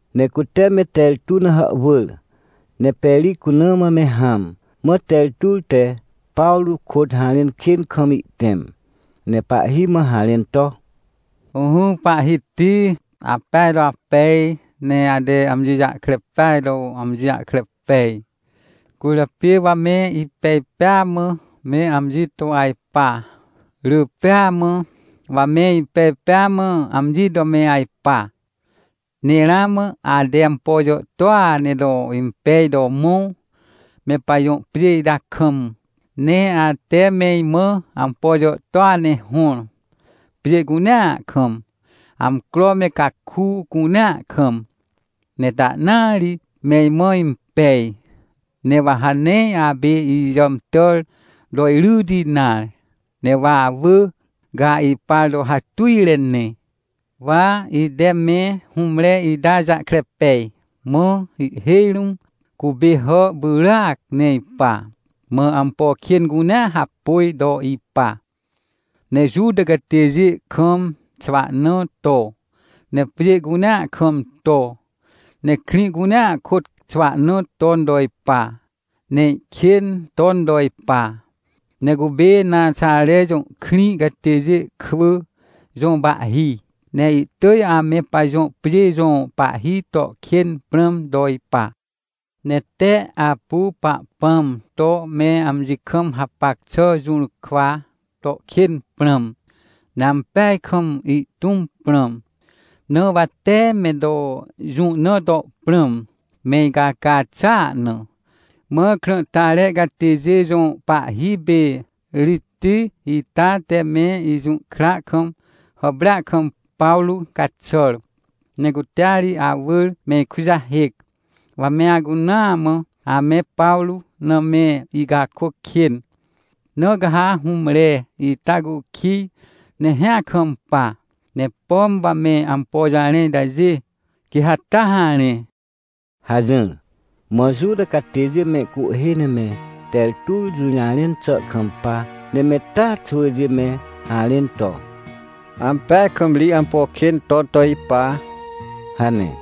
Ne cute me Tertur na hàhwỳr, ne Peri cuna mã me hãm, mã Tertur te Pawrô kôt harẽn kên kam ihtẽm, ne pahhi mã harẽn to: — Ỹhỹ, pahhiti! Apeaj to apej, ne ate amji jahkre peaj to amji jahkre pej. Cwỳrjapê wa me ipej pêa mã me amji to ajpa, rỳ pêa mã wa me ipej pêa mã amji to me ajpa. Ne ramã ate ampo jàhtôa ne to impej to mõ, me pajõ pjê ita kam. Ne ate me imã ampo jàhtôa ne hõr, pjê cunea kam, amcro me caku cunea kam, ne tahnaa ri me imã impej. Ne wa ha nee apê ijàmtàr to iryti nare, ne wa awỳ, ca ipar to hatujre ne. — Wa ite me hũmre ita jahkre pej, mã ihhêj rũm cupê hà pyràac ne ipa, mã ampo kên cunea hapôj to ipa. Ne Juta catêjê kam xwahna to, ne pjê cunea kam to, ne krĩ cunea kôt xwahna ton to ipa, ne ihkên ton to ipa. Ne cupê Naxare jõ krĩ catêjê kwỳ jõ pahhi, ne ihtỳj ame pajõ pjê jõ pahhi to kên prãm to ipa. Ne tee apu Pahpãm to me amji kam hapac xà jũrkwa to kên prãm, ne ampeaj kam ihtũm prãm. Na wa tee me to jũ na to prãm, me icaca xàa na. Mã krãhtare catêjê jõ pahhi pê Ritij ita te me ijũhkra kam, hàprêa kam, Pawrô caxàr. Ne cutea ri awỳr me ikujahêc, wa me acunaa mã ame Pawrô na me icakôc kên. Na ca ha hũmre ita cukij ne hĩa kampa, ne pom wa me ampo jarẽ itajê, quê ha taa harẽ — hajỹr. Mã Juta catêjê mehcuhhê ne me Tertur jũjarẽn xà kampa, ne me taa xwỳjê me harẽn to: — Ampeaj kam ri ampo kên ton to ipa — hane.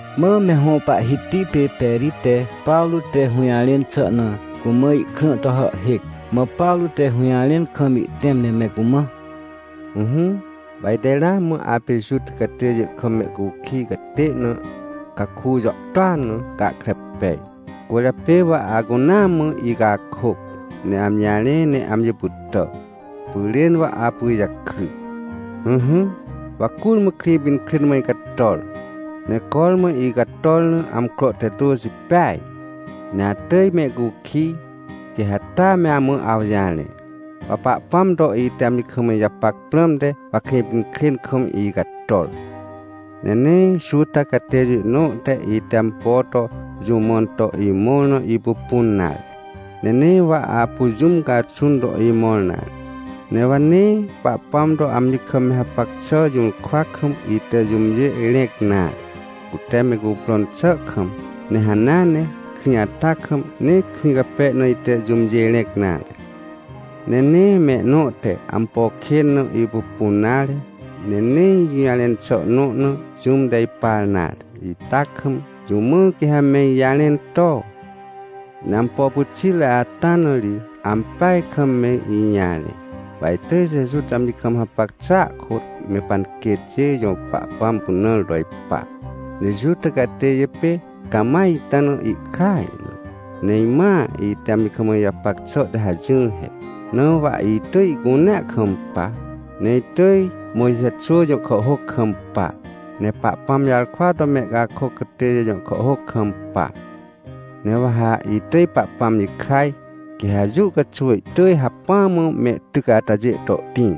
Mã me hõ pahhiti pê Peri te Pawrô te hũjarẽn xà na cumã ihkrã to hàhhêc. Mã Pawrô te hũjarẽn kam ihtẽm ne me cumã: — Ỹhỹ, wa ite ramã, apê Juta catêjê kam mehcukij catê na caku jàhtôa na, gahkre pej. Cwỳrjapê wa acunaa mã icakôc, ne amji jarẽ ne amji pytà, pyrên wa apu ijakry. — Ỹhỹ, wa curmã Krĩpinkrên mã icator. Ne cormã icator na amcro te tôxi peaj. Ne atỳj mehcukij, quê ha taa me amã awjarẽ. Wa Pahpãm to ite amji kam ijapac prãmte, wa Krĩpinkrên kam icator. Ne nee Juta catêjê nõ te ite ampo to jũ mãn to imõr na ipupun nare, ne nee wa apu jũm caxun to imõr nare, ne wa nee Pahpãm to amji kam me hapac xà jũrkwa kam, ite jũmjê rẽc nare, cute me cuprõn xà kam. Ne hanea ne krĩ ata kam, nee krĩ cape na ite jũmjê rẽc nare. Ne nee mehnõ te ampo kên na ipupun nare, ne nee ijũjarẽn xà nõ na, jũm te ipar nare ita kam, jũ mã quê me ijarẽn to? — Ne ampo pyxitre ata na ri ampeaj kam me ijarẽ. Wa itỳj Jeju te amji kam hapac xàa kôt, me panquêtjê jõ Pahpãm pynãr to ipa. Ne Juta catêjê pê cama ita na ihkaj na. Ne imãa ite amji kam ijapac xà te hajỹr he, na wa itỳj ihcunea kampa, ne itỳj Mojxe xwỳ jõ kàhhôc kampa, ne Pahpãm jarkwa to mehcakôc catêjê jõ kàhhôc kampa. Ne wa ha itỳj Pahpãm jikaj, quê ha jũ caxuw ihtỳj hacpỹa mã mehtyc atajê to ihtĩr.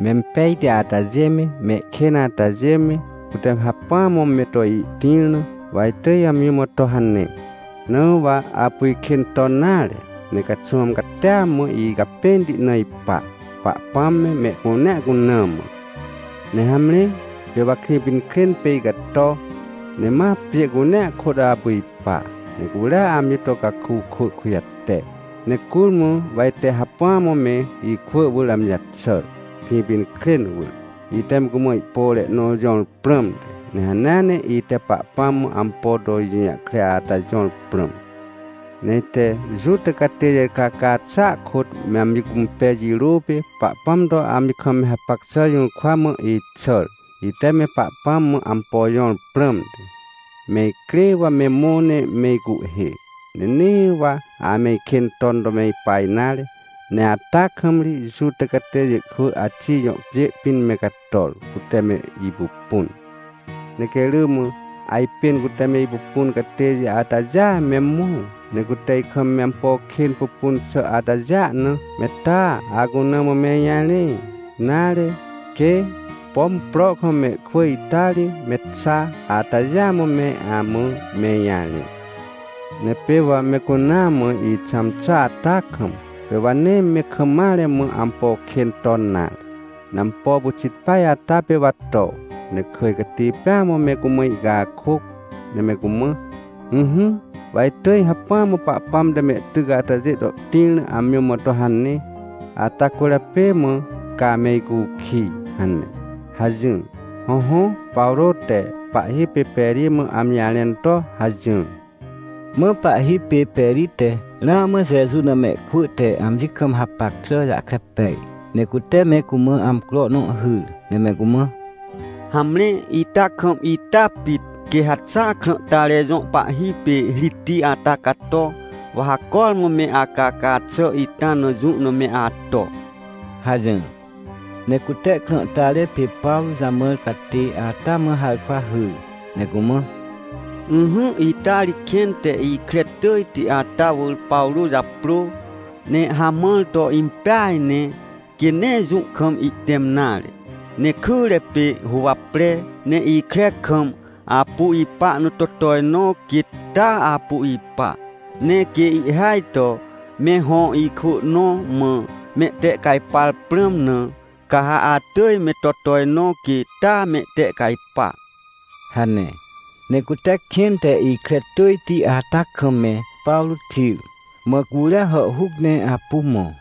Mempejti atajê me, mehkên atajê me, cute hacpỹa mã me to ihtĩr na, wa itỳj amji mã to hane. Na wa apu ikên ton nare, ne caxwãm catia mã icapẽnti na ipa, Pahpãm me, mehcunea cuna mã. — Ne hamre, pê wa Krĩpinkrên pê icato, ne ma pjê cunea kôt apu ipa, ne curia amji to caku kwỳ kujate. Ne curmã wa ite hacpỹa mã me ikwỳ wỳr amji jaxàr, Krĩpinkrên wỳr. Ite me cumã ihpore nõ jõr prãmte. Ne hanea ne ite Pahpãm mã ampo to ijũjahkre ata jõr prãm. Ne ite Juta catêjê caca xàa kôt me amji cũmpej jirô pê, Pahpãm to amji kam me hapac xà jũrkwa mã ixàr, ite me Pahpãm mã ampo jõr prãmte. Me icrê wa me mõ ne me icuhhê, ne nee wa ame ikên ton to me ipa nare, ne ata kam ri Juta catêjê kwỳ Axij jõ pjê pĩn me cator, cute me ipupun. Ne quê rỳ mã ajpên cute me ipupun catêjê atajêa me mõ, ne cute ikam me ampo kên pupun xà atajêa na, me taa acuna mã me ijarẽ, nare, quê, pom prohkam mehkwỳ ita ri me xa atajêa me amã me ijarẽ. Ne pê wa me cunaa mã ixãm xà ata kam, pê wa nee me kam mare mã ampo kên ton nare. Ne ampo pyxit peaj ata pê wa to, ne kỳj cati pêa mã me cumã icakôc, ne me cumã: “Ỹhỹ, wa itỳj hacpỹa mã Pahpãm te mehtyc atajê to tĩr na amji mã to hane, ata cwỳrjapê mã ca ame icukij” hane — hajỹr. Hõhõ, Pawrô te pahhi pê Peri mã amji jarẽn to hajỹr. Mã pahhi pê Peri te ramã Jeju na mehkwỳ te amji kam hapac xà jahkre pej. Ne cute me cumã amcro nõ hyr, ne me cumã: — Hamre, ita kam ita pit, quê ha xa krãhtare jõ pahhi pê Ritij ata cato, wa ha cormã me acaca xà ita na jũ na me ato — hajỹr. Ne cute krãhtare pê Pawrô jamãr catê ata mã harkwa hyr, ne cumã: — Ỹhỹ, ita ri kẽn te ikre tỳjti ata wỳr Pawrô japrô, ne hamãr to impeaj ne, quê nee jũ kam ihtẽm nare. Ne kyre pê huwapre, ne ikre kam apu ipa na to tojnõ, quêt taa apu ipa. Ne quê ihhêaj to me hõ ikwỳ nõ mã mehtehcajpar prãm na, ca ha atỳj me to tojnõ, quê taa mehtehcajpa — hane. Ne cute kẽn te ikre tỳjti ata kam me Pawrô xir, mã curia hàhhuc ne apu mõ.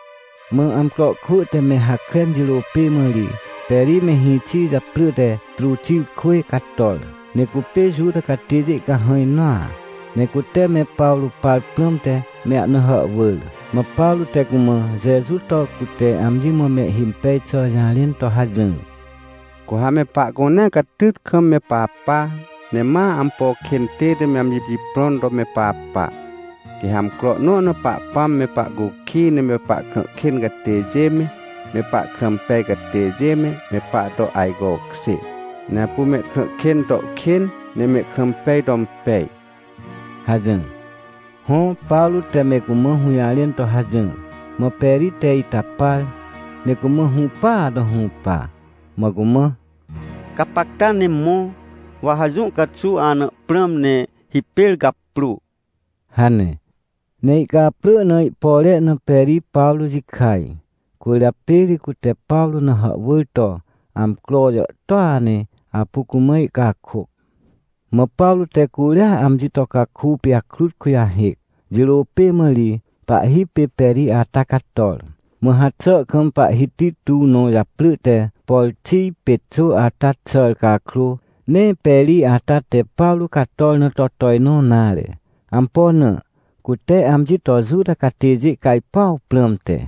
Mã amcro kwỳ te me hakren jirô pê mã ri Peri me hĩxi japrỳ te Truxirkwỳj cator, ne cupê Juta catêjê cahãj nõa. Ne cute me Pawrô par prãmte me ahna hàhwỳr. Mã Pawrô te cumã Jeju to cute amji mã mehhimpej xà jarẽn to hajỹr: — Cu ha me pahcunea catyt kam me papa, ne ma ampo kên tête me amji jiprõn to me papa. Quê ha amcro nõ na Pahpãm me pahcukij ne me pahkrã kên catêjê me, me pahkrã pej catêjê me, me pahto ajcokjê. Ne apu mehkrã kên to kên, ne mehkrã pej to impej — hajỹr. Hõ, Pawrô te me cumã hũjarẽn to hajỹr. Mã Peri te ita par, ne cumã hũpaa to hũpa, mã cumã: — Gapacta ne mõ. Wa ha jũ caxuw ana prãm, ne hipêr gaprô — hane. Ne ihcaprỳ na ihpore na Peri Pawrô jikaj. Cwỳrjapê ri cute Pawrô na hàhwỳr to amcro jàhtôa ne apu cumã ihcakôc. Mã Pawrô te curia amji to caku pijakrut kujahêc. Jirô pê mã ri pahhi pê Peri ata cator. Mã haxà kam pahhiti tuw nõ japrỳ te Porxij Pexô ata xàr cakrô, nee Peri ata te Pawrô cator na to tojnõ nare. Ampo na? Cute amji to Juta catêjê cajpuaw prãmte.